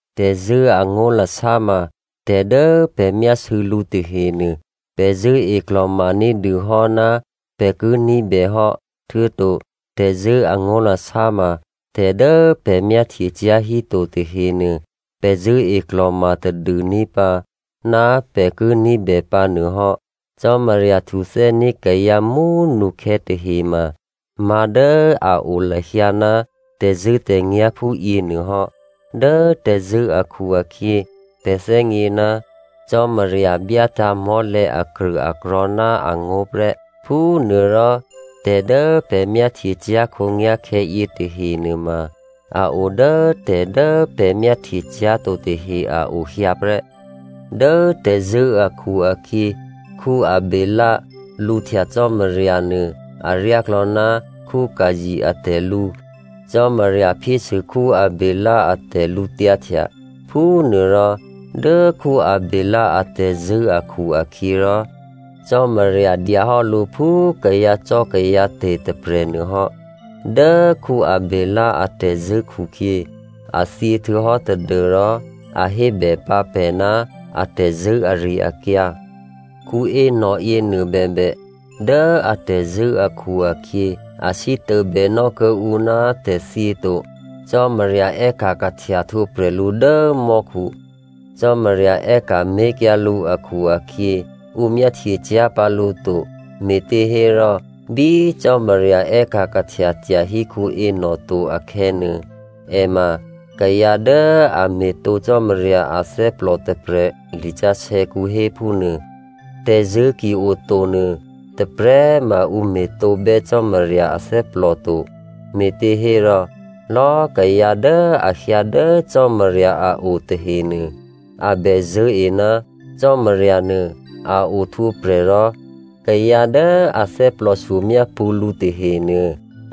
Tè̤zṳ̂́ angó̤lasá ma tè̤ dố pè̤ myásû̌ lǔ tahenuô, pè̤ zṳ̂́e klò̤ma ní̤dûhò́ ná pè̤ ki ní̤bè hò́. Htuô̌to tè̤zṳ̂́ angó̤lasá ma tè̤dố pè̤ myáhtyecyá̤ híto tahenuô, pè̤ zṳ̂́e klò̤ma tadû ní̤pǎ ná pè̤ ki ní̤bè pǎnuôhò́. Cò́marya htuthè́ní̤ kayǎ mú꤮ nukhè̌ tahe ma má̤dố a o lahyǎ ná tè̤zṳ̂́tè̤nyá̤ phúyěnuô hò́. Dố tè̤zṳ̂́ akhu-akhyě pè̤ thè́gně ná Cò́marya byátǎ̤ mò́lè̤̌ akrṳ̂akrò̤̌ ná angó̤ prè́. Phúnuôrò tè̤ dố pè̤ myáhtyecyá̤ khǒnyá̤khè̌ yětahe nuôma a o dố tè̤dố pè̤ myáhtye cyá̤to tahe a o hyǎ prè́. Dố tè̤zṳ̂́ akhu-akhyě, Abělè lǔhtya Cò́marya nuô aryáklò̌ ná Caino atè̤lǔ. Cò́marya phyésû Abělè a tè̤lǔtyǎhtya. Phúnuôrò, dố Abělè atè̤zṳ̂́ akhu-akhyěrò, Cò́marya dyahò́ lǔ phú kayǎcò́kayǎte̤ tôprè̤ nuôhò́. Dố Abělè atè̤zṳ̂́ khukhyě, a thyě htuô̌hò́ tadû́rò a hébèpǎ pè̤ ná atè̤zṳ̂́ ari-akyǎ. Enoch yěnuô bèbè, dố atè̤zṳ̂́ akhu-akhyě, a sítôbènò́ kuô̌ǔ ná tè̤thyě to, Cò́marya è́ka̤ kahtya htwǒprè̤ lǔ dố mò́khu. Cò́marya è́ka̤ mé̤kyǎ lǔ akhu-akhyě, ǔ myáhtyecyá̤ pǎ lǔ to. Me̤těhérò bí Cò́marya è́ka̤ kahtya tyahí Enoch to akhè̌nuô, è ma kayǎ dố a me̤tǒ Cò́marya athè́plò tôprè̤, lisǎsè̌kǔ héphúnuô. Tè̤zṳ̂́ ki oto nuô, tôprè̤꤮ ma ǔ me̤tǒbè́ Cò́marya athè́plò to, me̤těhérò, lò̌꤮ kayǎ dố a hyǎ dố Cò́marya a o tahenuô, a bè zṳ̂́e ná Cò́marya nuô a ohtwǒprè̤ rò kayǎ dố a thè́plòshyo myápṳ̌ lǔ tahenuô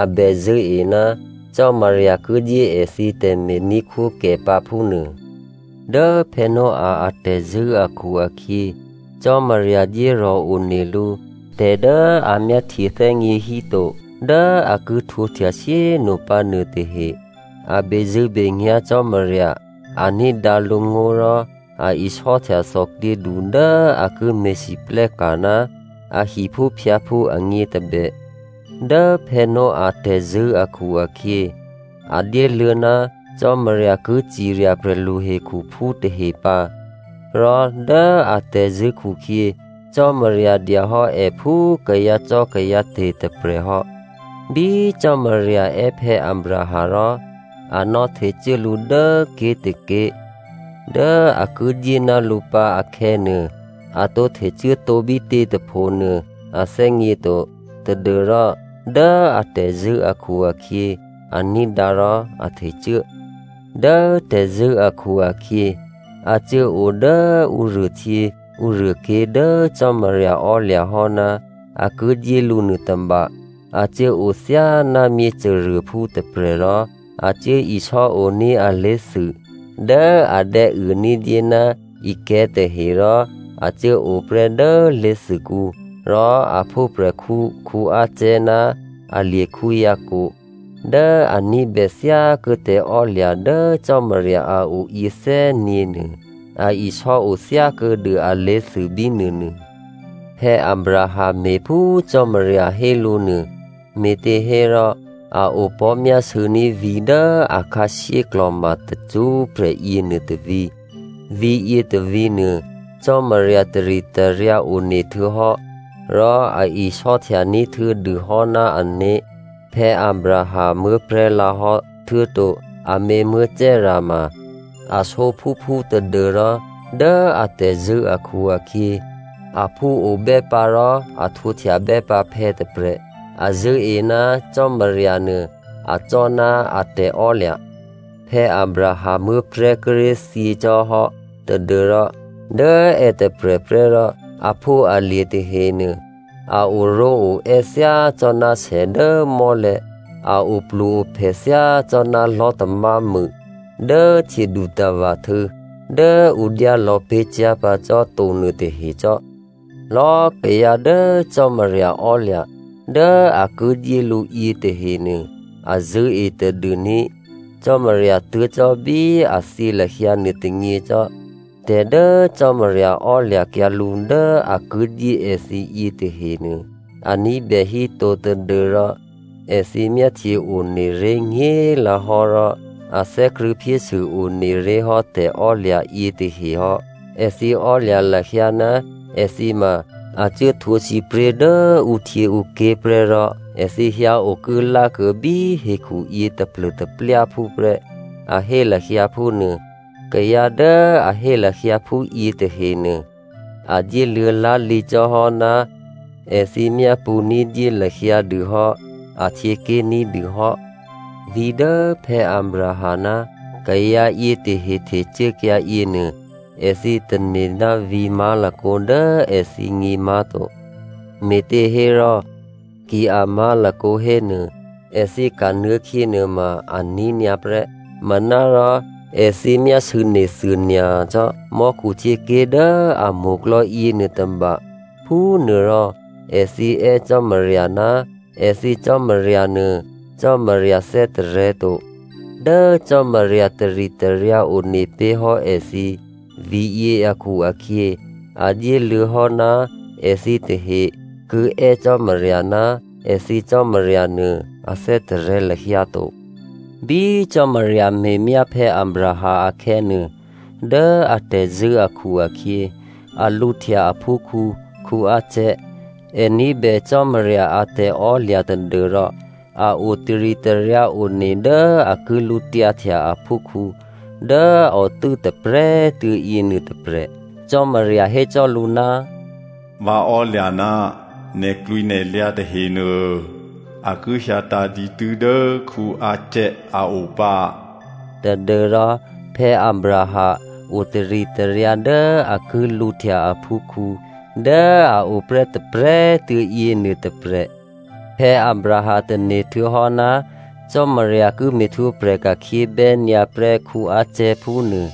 a bè zṳ̂́e ná Cò́marya ki dyé èthǐ tè̤me̤ní̤khwókè pǎ phúnuô. Dố Noah atè̤zṳ̂́ akhu-akhyě, Cò́marya dyérò̤ one lǔ tè̤dố a myáhtye thè́gně híto dố a ki htwǒhtya shyé꤮ nopǎ nuôtahe. A bezṳ̂́benyá̤ Cò́marya, a ní̤dǎ lǔngó̤ rò a isò́htya thòklyědu dố a ki me̤lwóhteka̤ ná a hiphúphyǎphú agně tôbè. Dố Noah tè̤zṳ̂́ akhu-akhyě, a dyéluô̌ ná Cò́marya ki cirya prè̤lu hekhuphú tahe pǎ. Rò dố atè̤zṳ̂́ khukhyě, Cò́marya dyahò́ è phú kayǎcò́kayǎte̤ tôprè̤ hò́. Bí Cò́marya è́ Abraham rò a nò̌htecuố lǔ dố ké̤tôké̤ dố a ki dyé ná lǔ pǎ akhè̌nuô, a tǒ htecuố tǒ bítě tôphonuô a thè́gně to tadû́rò dố atè̤zṳ̂́ akhu-akhyě a ní̤dǎ rò a htecuố. Dố tè̤zṳ̂́ akhu-akhyě a cuốo dố ǔruôhtyě ǔruôké̤ dố Cò́marya ò́lya̤ hò́ ná a ki dyé lǔ nuôtôba. A cuốo thyáná myěcôruôphú tôprè̤ rò a cuố isò́oní̤ alé̤thû dố adè̌uô ní̤dyé ná ikè̤̌ tahe rò a cuốo prè́ dố lé̤thûkǔ. Rò a phúprè̤khǔ Isaac ná alye̤ Jacob dố a ní̤bè thyákuô̌ tè̤ò́lya̤ dố Cò́marya a o yě thè́gněnuô, a isò́o thyákuô̌ dû alé̤thû bínuônuô. Abraham me̤ phú Cò́marya hé lǔ nuô, me̤těhérò a opò̤́ myásû̌ní̤ vǐ̤ dố akhǎshyé klò̤ma tacṳ́prè̤ yěnuô tôvǐ̤. Vǐ̤ yětôvǐ̤nuô, Cò́marya taritaryǎ one htuô̌hò́ rò a isò́htya ní̤htuô̌dû hò́ ná ané̤. Abraham muố̤prè̤́ lǎhò́, htuô̌to amě Sara ma a sǒphúphú tadû́rò dố atè̤zṳ̂́ akhu-akhyě, aphú obè́pǎ rò a htwǒhtyabè́pǎ phè̌ tôprè̤. A zṳ̂́e ná Cò́marya nuô acò́ ná a tè̤ò́lya̤. Abraham muố̤prè̤́ kíré̤ thyěcò́hò́ tadû́rò dố è tôprè̤prè́ rò aphúalye̤ tahenuô a oró̤oè́ thyácò́ná sè dố mò́lè̤̌, a oplu-ophè thyácò́ná lò̤́tamámû dố htyědutava̤ htû̌ dố ǔ dyálò̌ pé̤ cyá̤pǎ cò́ to nuôtahecò́. Lò̌꤮ kayǎ dố Cò́marya ò́lya̤ dố a ki dyé lǔ yětahenuô a zṳ̂́e tadûní̤ Cò́marya tuố̤ cò́ bí a thyě lahyǎ nuôtônyě cò́. Tè̤ dố Cò́marya ò́lya̤kyǎ lǔ dố a ki dyé èthǐ yětahenuô, a ní̤bè híto, tadû́rò èthǐ myáhtye one ré̤ nyě̤꤮ lǎhò́ rò a thè́krṳ̂̌ phyésû one ré̤hò́ tè̤ò́lya̤ yětahe hò́. Èthǐ ò́lya̤ lahyǎ ná èthǐ ma a cuố htwǒ sǐpré̤ dố ǔhtyěǔké̤ prè́, rò èthǐ hyǎ okuốlákuô̌ bí hekhuyě taplô̤taplyáphú prè́, a hé lahyǎ phúnuô. Kayǎ dố a hé lahyǎ phúyě tahenuô a dyéluô̌ lá̤lǐcò́hò́ ná èthǐ myápṳ̌ ní̤dyé lahyǎ dûhò́ ahtyěké̤ ní̤dû hò́. Vǐ̤ dố Abraham ná kayǎ yětahe htecuốkyǎ yěnuô, èthǐ tane̤ ná vǐ̤ má̤lakǒ dố èthǐgně má̤to. Me̤těhérò, ki a má̤lakǒ hénuô, èthǐ kanuô̌khyě nuôma aní̤ nyǎ prè́. Manárò èthǐ myásû̌ nethuô nyacò́ mò́khu htyěké̤ dố a mo̤klò̌ yěnuô tôba. Phúnuôrò èthǐ è́ Cò́marya ná èthǐ Cò́marya nuô, Cò́marya thè́tarè̤̌to. Dố Cò́marya taritaryǎ one pé̤hò́ èthǐ vǐ̤yě akhu-akhyě, a dyéluô̌ hò́ ná èthǐ tahe ki è́ Cò́marya ná èthǐ Cò́marya nuô a thè́tarè̤̌ lahyǎ to. Bí Cò́marya me̤myá Abraham akhè̌nuô, dố atè̤zṳ̂́ akhu-akhyě a lǔhtya aphúkhǔ Isaac. È ní̤bè Cò́marya a tè̤ò́lya̤ tadû́rò a o taritaryǎ one dố a ki lǔtyǎhtya aphúkhǔ dố a otû́ tôprè̤꤮ tuô̌ yěnuô tôprè̤. Cò́marya hécò́ lǔ, “Vǎ ò́lya̤ ná nè̤klwǐnè̤lyǎ tahenuô a ki hyǎtǎ̤ dǐtû́ dố Isaac a o pǎ.” Tadû́rò Abraham o taritaryǎ dố a ki lǔhtya aphúkhǔ dố a o prè́ tôprè̤꤮ tuô̌ yěnuô tôprè̤. Abraham tane̤ htuô̌hò́ ná Cò́marya ki me̤htwǒprè̤ ka̤khyě bè́nyǎ prè́ Isaac phúnuô.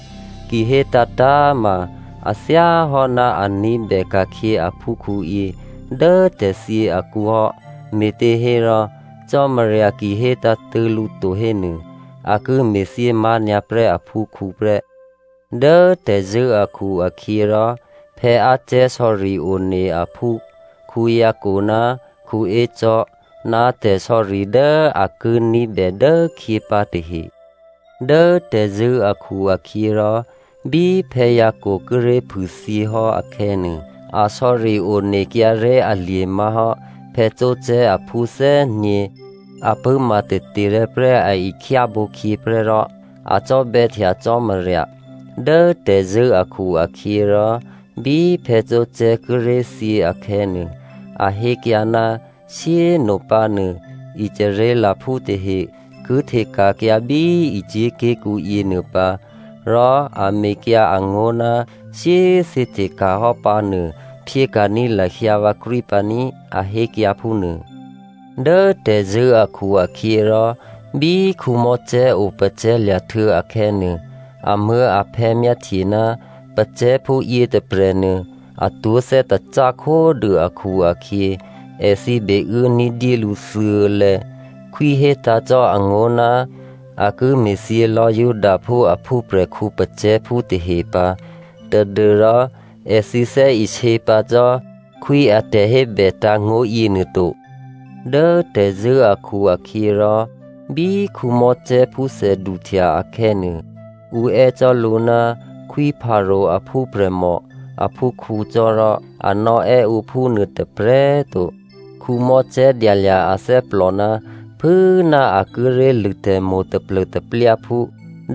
Ki hé tǎ̤tǎ̤ ma a thyáhò́ ná a ní̤bè ka̤khyě aphúkhǔyě dố tè̤thyě akǔ hò́, me̤těhérò Cò́marya ki hé tǎ̤tṳ̂̌ lǔ to hénuô, a ki me̤thyě má̤nyǎ prè́ aphúkhǔ prè́. Dố tè̤zṳ̂́ akhu-akhyěrò, Isaac sò̌ri one aphú Jacob ná Esau ná tè̤sò̌ri dố a ki ní̤bè dốkhyě pǎ tahe. Dố tè̤zṳ̂́ akhu-akhyěrò, bí Jacob kíré̤ phûthyě hò́ akhè̌nuô, a sò̌ri onekyǎré̤ alye̤ má̤hò́ Joseph aphú thè́gně. A pṳ̂́ma taterè̤̌ prè́ a ihtyábǒkhyě prè́ rò a cò́bè̌htya Cò́marya. Dố tè̤zṳ̂́ akhu-akhyěrò, bí Joseph kíré̤ thyě akhè̌nuô, a hékyǎ ná shyé꤮ nopǎ nuô, Israelphú tahe ki hteka̤kyǎ bí Egypt ké̤kǔ yěnuô pǎ. Rò a mekyǎ angó̤ ná shyé꤮ thǐ hteka̤hò́ pǎnuô, phyéka̤ní̤ lahyǎ vǎkrwí pǎní꤮, a hékyǎ phúnuô. Dố tè̤zṳ̂́ akhu-akhyěrò, bí Mosè opacè̤̌lya̤htuô̌ akhè̌nuô, amuố̤aphè̌ myáhtye ná pacè̤̌phú yětôprè̤nuô, atwó̤ thè́tacá khódû akhu-akhyě, èthǐ beuố ní̤dyé lǔ thuô̌lè̌. Khwí hétǎ̤ cò́ angó̤ ná a ki me̤thyě lò̌ Judaphú a phúprè̤khǔ pacè̤̌phú tahe pǎ tadû́rò èthǐ thè́isě pǎ cò́ khwí a tè̤hébè tǎ̤ngó̤ yěnuô to. Dố tè̤zṳ̂́ akhu-akhyěrò, bí Mosè phúthè duhtya akhè̌nuô, ǔ è́ cò́ lǔ ná Khwí Pharao aphúprè̤mò aphúkhǔ cò́rò, a nò̌ è́ ǔ phúnuô tôprè̤꤮ to. Mosè dyalya̤ athè́plò, phû꤮ ná a kíré̤ lṳ̂ tè̤mo̤ taplô̤taplyáphú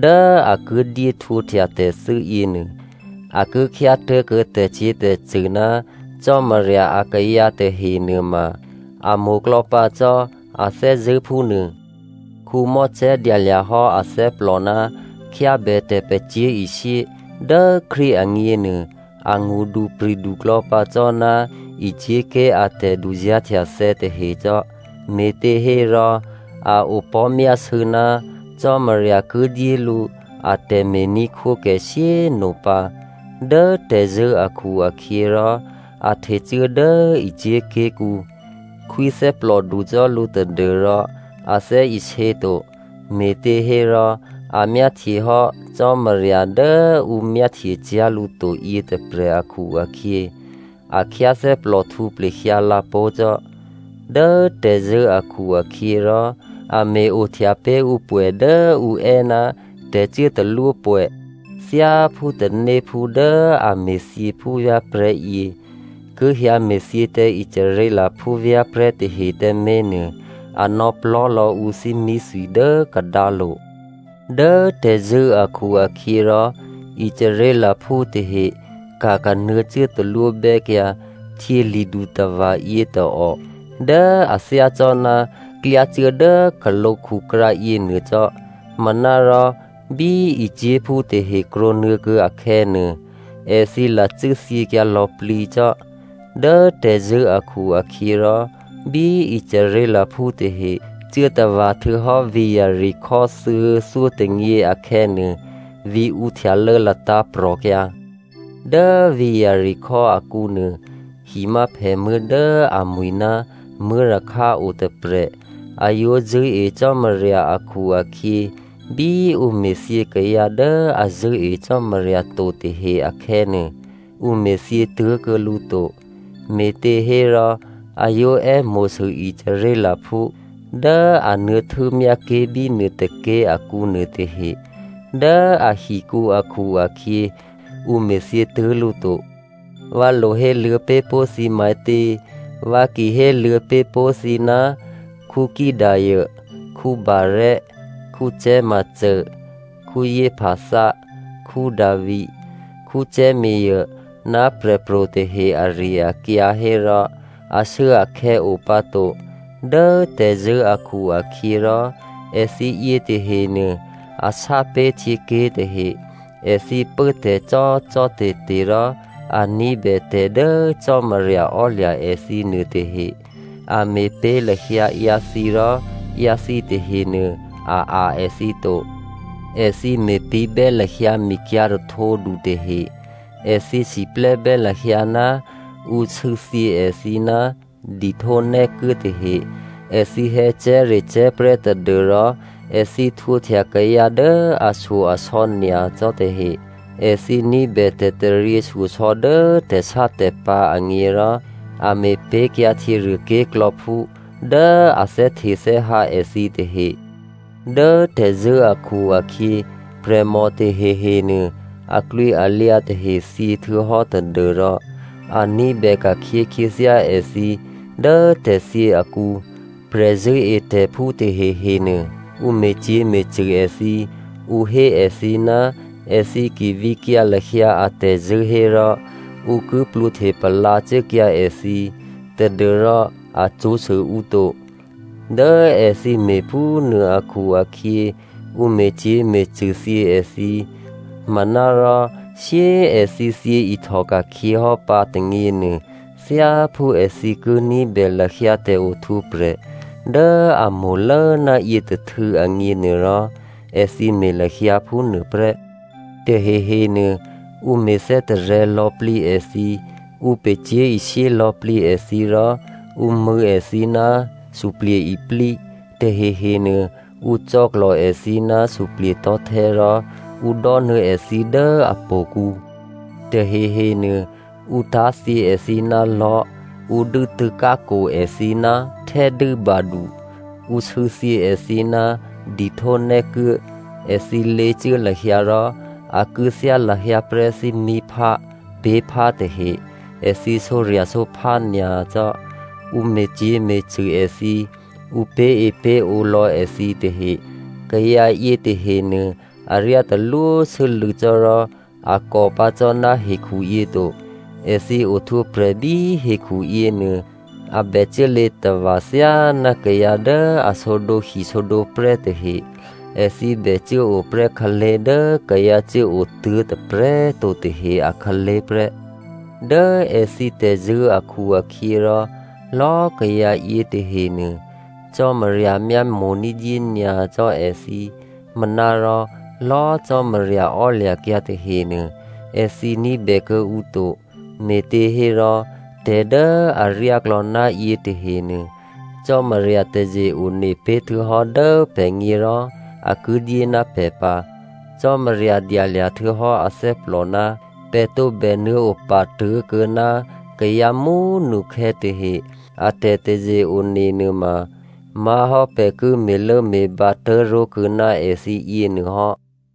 dố a ki dyé htwǒhtya tè̤thû́ yěnuô, a ki khyátố̤kuô̌ tè̤cyě̤tè̤cṳ̂ ná Cò́marya akayǎ tahenuôma, a mo̤klò̌ pǎ cò́ a thè́zṳ̂́ phúnuô. Mosè dyalya̤ hò́ athè́plò, khyábè tè̤pacyé̤ishyé dố Krístu agněnuô, angṳdupri̤du klò̌pǎ cò́ ná Egypt ké̤ a tè̤duzá̤htyathè̌ tahe cò́, me̤těhérò a opò̤́myásû̌ ná Cò́marya ki dyé lǔ a tè̤me̤ní̤khwókè shyé꤮ nopǎ. Dố tè̤zṳ̂́ akhu-akhyěrò, a htecuố dố Egypt ké̤kǔ. Khwí thè́plòdu cò́ lǔ tadû́rò a thè́isě to. Me̤těhérò a myáhtyehò́ Cò́marya dố ǔ myáhtyecyá̤ lǔ to yětôprè̤ akhu-akhyě, a khyáthè́plòhtǔ plehyǎ lǎpó̤ cò́. Dố tè̤zṳ̂́ akhu-akhyěrò, a me̤-ohtya pé̤ ǔ pwè̌ dố ǔ è́ ná tè̤cuốtalwópwè̌. Thyáphú tanéphú dố a me̤thyě phúvyá̤prè̤́yě ki hyǎ me̤thyě tǎ Israelphú vyá̤prè̤́ tahe tǎmé̤ nuô, a nò̌ plò́lò̌ ǔ thímíthwi dố kadǎlo̤. Dố tè̤zṳ̂́ akhu-akhyěrò, Israelphú tahe ka̤kanuô̌ cuốtalwóbè́kyǎ Htyěli̤dutava̤ yětôò dố a thyácò́ná klyá cuố dố khǒlǒkhukrǎ yěnuô cò́. Manárò bí Egyptphú tahe krwǒnuô̌ kuô̌ akhè̌nuô, èthǐ lacû́ thyěkyǎ lò̌plǐ cò́. Dố tè̤zṳ̂́ akhu-akhyěrò, bí Israelphú tahe cuố tava̤ htuô̌hò́ vǐ̤ Jeriko thuô̌thyótônyě akhè̌nuô, vǐ̤ǔ htyalô̌ latǎ̤prò̤kyǎ. Dố vǐ̤ Jeriko akǔnuô, himyáphèmuố̤ dố amwi̤ ná Rahab otôprè̤. A yǒ zṳ̂́e Cò́marya akhu-akhyě, bí ǔ me̤thyě kayǎ dố a zṳ̂́e Cò́marya to tahe akhè̌nuô, ǔ me̤thyě tuố̤kuô̌ lǔ to. Me̤těhérò a yǒ è́mo̤sû Israelphú dố a nuô̌ htû́myá ké̤bínuô tôké̤ akǔ nuôtahe dố ahikǔ akhu-akhyě, ǔ me̤thyě tuố̤ lǔ to. Vǎ lo héluô̌ pé̤ pó̤ thǐ matě? Vǎ ki héluô̌ pé̤ pó̤ thǐ ná Gideon, Barak, Samsone, Jephtha, Davi, Samuelè ná prè̤pro̤ tahe ari-akyǎ hérò ashuốakhè̌ o pǎ to. Dố tè̤zṳ̂́ akhu-akhyěrò, èthǐ yětahenuô, a sápé̤ htyěké̤ tahe. Èthǐ pốtè̤ cò́cò́te̤te̤ rò a ní̤bè tè̤ dố Cò́marya ò́lya̤ èthǐ nuôtahe. A me̤pé̤ lahyǎ ǎyǎthǐ rò ǎyǎthǐ tahenuô a a̤ èthǐ to. Èthǐ me̤pǐ̤bè́ lahyǎ mikyǎ̤ rahtǒdu tahe. Èthǐ siplè́bè́ lahyǎ ná ǔ sû̌thyě èthǐ ná dihtónè́kuố tahe. Èthǐ hè̌cè̤́recè̤́ prè́ tadû́rò èthǐ htwǒhtya kayǎ dố ashyo-asò̌ nyacò́ tahe. Èthǐ ní̤bè tè̤taryěshyosò̌ dố tè̤sátè̤pǎ̤ agně rò a me̤pé̤kyǎ htyěruô ké̤klò̌phú dố a thè́htethè́hǎ èthǐ tahe. Dố tè̤zṳ̂́ akhu-akhyě, prè̤mò tahehenuô, aklwǐalyǎ tahe thyě htuô̌hò́ tadû́rò a ní̤bè ka̤khyě khyěthyá èthǐ dố tè̤thyě akǔ. Prè̤zṳ̂́etè̤phú tahehenuô, ǔ me̤cyě̤me̤cṳ̂ èthǐ. Ǔ hé èthǐ ná èthǐ ki vǐkyǎ lahyǎ atè̤zṳ̂́ hérò, ǔ ki plwǒhte palǎ cuốkyǎ èthǐ tadû́rò a cṳ̌sû ǔ to. Dố èthǐ me̤phúnuô akhu-akhyě, ǔ me̤cyě̤me̤cṳ̂thyě èthǐ. Manárò, shyé꤮ èthǐ thyě ihtòka̤khyě hò́ pǎ tônyěnuô, thyáphú èthǐ ki ní̤bè lahyǎ tè̤ohtwǒprè̤ dố a mo̤lố ná yětôhtû̌ agněnuôrò, èthǐ me̤ lahyǎ phúnuô prè́. Tahehenuô, ǔ me̤ thè́tarè̤̌ lò̌plǐ èthǐ, ǔ pacyé̤ishyé lò̌plǐ èthǐ, rò ǔ mṳ̂̌ èthǐ ná suplye̤-iplí, tahehenuô ǔ cò̌klò̤ èthǐ ná suplye̤tò̤́htè́, rò ǔ dò́nuô̌ èthǐ dố htò̌kǔ. Tahehe nuô ǔ tá̤thyě èthǐ ná lò̤́, ǔ dû́tû̌ khǎkwo èthǐ ná htè́dû́badu, ǔ sû̌thyě èthǐ ná dihtó nè́kuố. Èthǐ lěcuố lahyǎ rò a kû̌thyá lahyǎ prè́ thímíphá, pé̤phá tahe, èthǐ sǒrya̤sǒphá nyacò́, ǔ me̤cyě̤me̤cṳ̂ èthǐ. Ǔ pé̤epé̤ǒ lò̌ èthǐ tahe. Kayǎ yětahenuô aryá talwósû́lû̌ cò́ rò a kò pǎ cò́ ná hekhuyě to. Èthǐ ohtwǒprè̤ bí hekhu yěnuô, a bè cuốlě tava̤ thyáná kayǎ dố a sǒdǒhi sǒdǒprè́ tahe, èthǐ bè cuốo prè́ khǎlé̤ dố kayǎ cuốotuố̤ tôprè̤꤮ to tahe akhǎlé̤ prè́. Dố èthǐ tè̤zṳ̂́ akhu-akhyěrò, lò̌꤮ kayǎ yětahenuô, Cò́marya myámo̤ ní̤dyé nyacò́ èthǐ. Manárò lò̌꤮ Cò́marya ò́lya̤kyǎ tahenuô, èthǐ ní̤bè kuô̌ǔ to. Me̤těhérò tè̤ dố aryáklò̌ ná yětahenuô, Cò́marya taze-one pé̤ htuô̌hò́ dố pè̤gně rò a ki dyé ná pè̤ pǎ. Cò́marya dyalya̤ htuô̌hò́ athè́plò ná pè̤ tǒbè nuô̌ opa tuố̤kuô̌ ná kayǎ mú꤮ nukhè̌ tahe. A tè̤taze-one nuôma má̤hò́ pè̤ ki me̤lốme̤bǎ tố̤ró̤kuô̌ ná èthǐ yěnuôhò́.